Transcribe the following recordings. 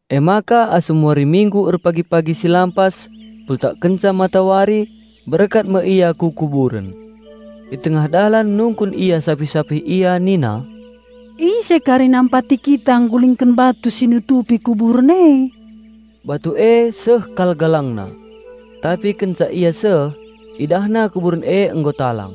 Emaka asum wari Minggu erpagi-pagi si lampas, pultak kenca matawari, berkat me ia ku kuburen. I tengah dalan nungkun ia sapih-sapih ia nina, "Ise kari nampati kita nggulingken batu si nutupi kuburen e?" Batu e seh kal galangna. Tapi kenca ia seh, idahna kuburen e nggo talang.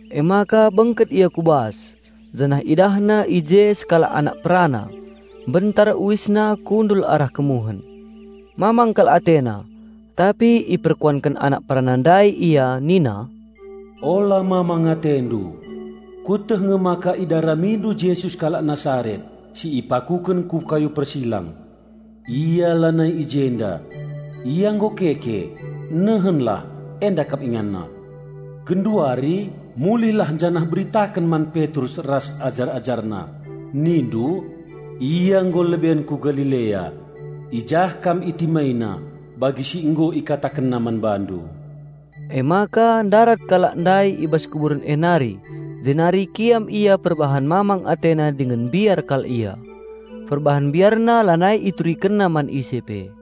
Emaka bengket ia ku bas, janah idahna i je sekalak anak perana, mbentar uisna kundul arah kemuhen. Mamang kal atena. Tapi iperkuanken anak perana ndai ia nina, "Ola mamang atendu! Kueteh nge maka idaramindu Jesus kalak Nasaret si ipakuken ku kayu persilang. Ia lanai i jenda. Ia nggo keke! Nehenlah! Enda kap InganNa. Genduari mulihlah janah beritaken man Petrus ras ajar-AjarNa, nindu, 'Ia nggo leben ku Galilea; i jah kam ItimaiNa bagi si nggo IkatakenNa man bandu.'" Emaka ndarat kalak ndai i bas kuburen e nari jenari kiam ia perbahan mamang atena dingen mbiar kal ia. Perbahan biarna lanai iturikenna man ise pe.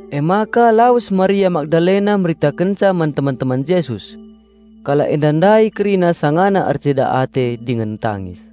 Emaka lawes Maria Magdalena meritakenca man teman-teman Jesus. Kalak enda ndai kerina sangana erceda ate dingen tangis.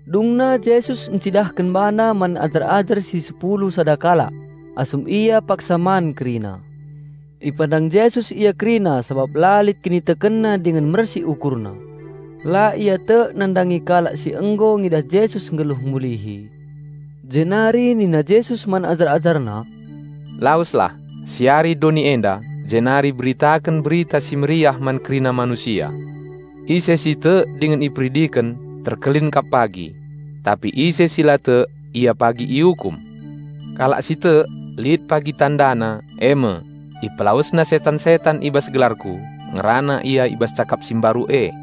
Dungna Jesus ncidahken BaNa man ajar-ajar si sepulu sada kalak, asum ia paksa man kerina. Ipandang Jesus ia kerina sabap la lit kinitekenna dingen mersik ukurna. La ia tek nandangi kalak si nggo ngidah Jesus nggeluh mulihi; jenari nina Jesus man ajar-AjarNa, "Laweslah, siari doni enda jenari beritaken Berita Si Mehuli man kerina manusia. Ise si tek dingen iperidiken terkelin kap pagi. Tapi ise si la tek ia pagi iukum. Kalak si tek lit pagi tandana e me: Ipelawesna setan-setan i bas gelarKu, ngerana ia i bas cakap si mbaru e.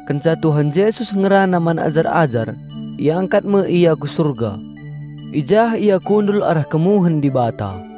Kenca Tuhan Jesus ngerana man ajar-ajar, iangkat me Ia ku Surga. I jah Ia kundul arah kemuhen Dibata.